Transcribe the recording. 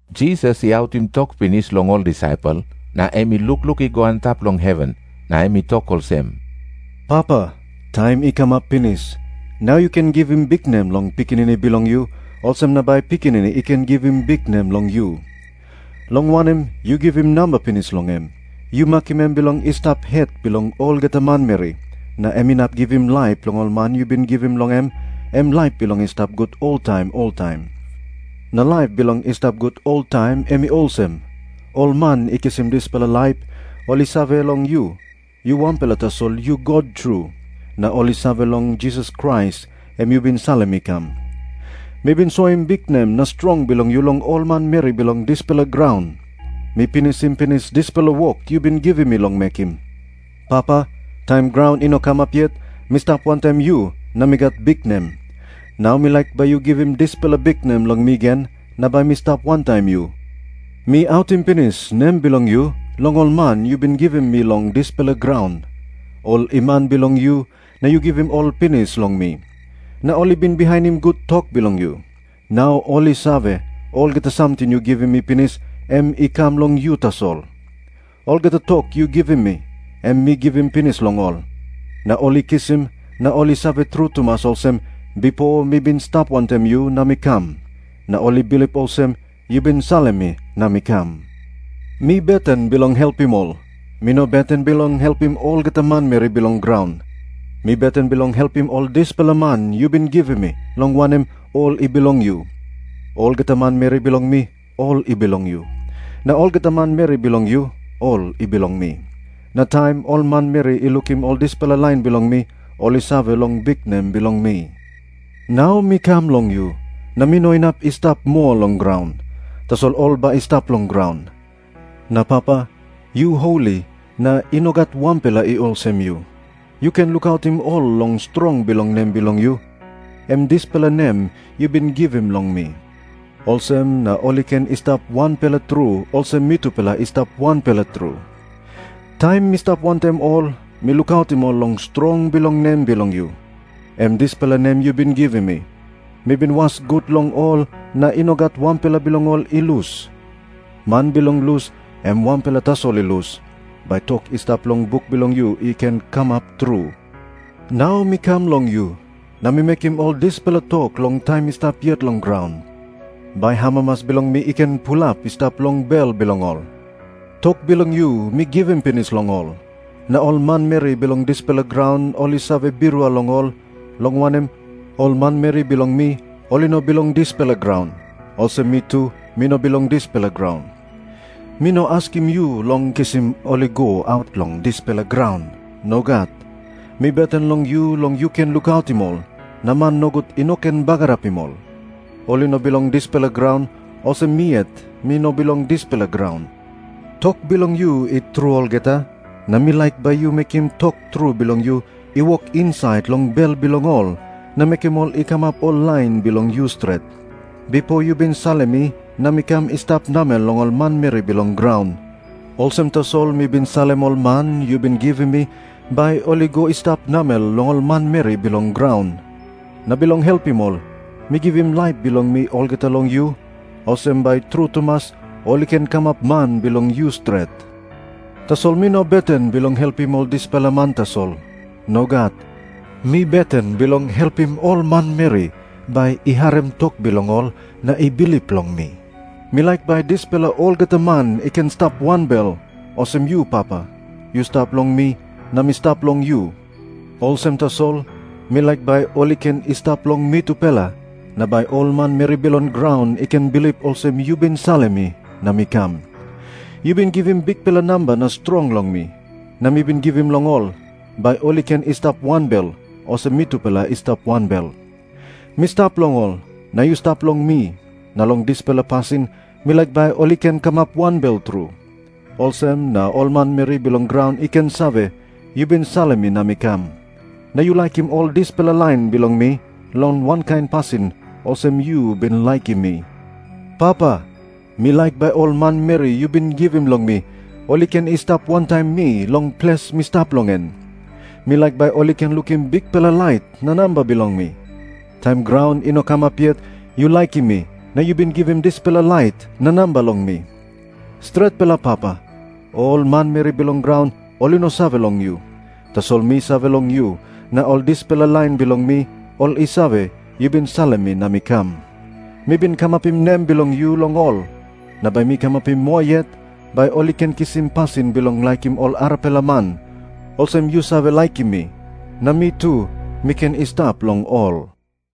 Jisas i autim tok pinis long ol disaipel, na em i lukluk i go antap long heven, na em i tok olsem, “Papa, taim i kamap pinis. Nau yu ken givim biknem long Pikinini bilong yu, olsem na bai Pikinini i ken givim biknem long yu. Long wanem, yu givim namba pinis long em. Yu makim em bilong i stap het bilong olgeta manmeri, na em inap givim laip long ol man yu bin givim long em, em laip bilong i stap gut oltaim oltaim. Na laip bilong i stap gut oltaim, em i olsem. Ol man i kisim dispela laip, ol i save long yu, yu wanpela tasol yu God tru. Na ol i save long Jisas Krais, em yu bin salim i kam. “Mi bin soim biknem na strong bilong yu long ol manmeri bilong dispela graun. Mi pinisim pinis dispela wok yu bin givim mi long mekim. Papa, taim graun i no kamap yet, mi stap wantaim yu na mi gat biknem. Nau mi laik bai yu givim dispela biknem long mi gen na bai mi stap wantaim yu. “Mi autim pinis nem bilong yu long ol man yu bin givim mi long dispela graun. Ol i man bilong yu, na yu givim ol pinis long mi. Na ol i bin bihainim gut tok bilong yu. Nau ol i save, olgeta samting yu givim mi pinis, em i kam long yu tasol. Olgeta tok yu givim mi, em mi givim pinis long ol. Na ol i kisim, na ol i save tru tumas olsem, bipo mi bin stap wantaim yu na mi kam. Na ol i bilip olsem, yu bin salim mi na mi kam. “Mi beten bilong helpim ol. Mi no beten bilong helpim olgeta manmeri bilong graun. Mi beten bilong helpim ol dispela man yu bin givim mi, long wanem, ol i bilong yu. Olgeta manmeri bilong mi, ol i bilong yu. Na olgeta manmeri bilong yu, ol i bilong mi. Na taim ol manmeri i lukim ol dispela lain bilong mi, ol i save long biknem bilong mi. “Nau mi kam long yu, na mi no inap i stap moa long graun. Tasol ol bai i stap long graun. Na Papa, yu holi na i no gat wanpela i olsem yu, yu ken lukautim ol long strong bilong nem bilong yu, em dispela nem yu bin givim long mi. Olsem na ol i ken i stap wanpela tru, olsem mitupela i stap wanpela tru. Taim mi stap wantaim ol, mi lukautim ol long strong bilong nem bilong yu, em dispela nem yu bin givim mi. Mi bin was gut long ol na i no gat wanpela bilong ol i lus. Man bilong lus, em wanpela tasol i lus, bai tok i stap long buk bilong yu i ken kamap tru. Nau mi kam long yu. Na mi mekim ol dispela tok long taim mi stap yet long graun, bai amamas bilong mi i ken pulap i stap long bel bilong ol. “Tok bilong yu, mi givim pinis long ol. Na ol manmeri bilong dispela graun ol i save birua long ol, long wanem, ol manmeri bilong mi ol i no bilong dispela graun, olsem mi tu mi no bilong dispela graun. Mi no askim yu long kisim ol i go aut long dispela graun. Nogat. Mi beten long yu long yu ken lukautim ol, na man nogut i no ken bagarapim ol. Ol i no bilong dispela graun, olsem mi yet mi no bilong dispela graun. Tok bilong yu i tru olgeta, na mi laik bai yu mekim tok tru bilong yu i wok insait long bel bilong ol, na mekim ol i kamap ol lain bilong yu stret. Bipo yu bin salim mi na mi kam i stap namel long ol manmeri bilong graun. Olsem tasol mi bin salim ol man yu bin givim mi bai ol i go i stap namel long ol manmeri bilong graun. Na bilong helpim ol, mi givim laip bilong mi olgeta long yu, olsem bai tru tumas ol i ken kamap man bilong yu stret. “Tasol mi no beten bilong helpim ol dispela man tasol. Nogat. Mi beten bilong helpim ol manmeri bai i harim tok bilong ol na i bilip long mi. Mi laik bai dispela olgeta man i ken i stap wanbel, olsem yu Papa, yu stap long mi na mi stap long yu. Olsem tasol mi laik bai ol i ken i stap long mitupela, na bai ol manmeri bilong graun i ken bilip olsem yu bin salim mi na mi kam. Yu bin givim bikpela namba na strong long mi, na mi bin givim long ol, bai ol i ken i stap wanbel, olsem mitupela i stap wanbel. Mi stap long ol, na yu stap long mi, na long dispela pasin mi laik bai ol i ken kamap wanbel tru. Olsem na ol manmeri bilong graun i ken save, yu bin salim mi na mi kam, na yu laikim ol dispela lain bilong mi long wankain pasin olsem yu bin laikim mi. “Papa, mi laik bai ol manmeri yu bin givim long mi ol i ken i stap wantaim mi long ples mi stap long en. Mi laik bai ol i ken lukim bikpela lait na namba bilong mi. Taim graun i no kamap yet, yu laikim mi, na yu bin givim dispela lait na namba long mi. Stretpela Papa, ol manmeri bilong graun ol i no save long yu. Tasol mi save long yu. Na ol dispela lain bilong mi, ol i save, yu bin salim mi na mi kam. Mi bin kamapim nem bilong yu long ol. Na bai mi kamapim moa yet, bai ol i ken kisim pasin bilong laikim ol arapela man, olsem yu save laikim mi. Na mi tu mi ken i stap long ol.”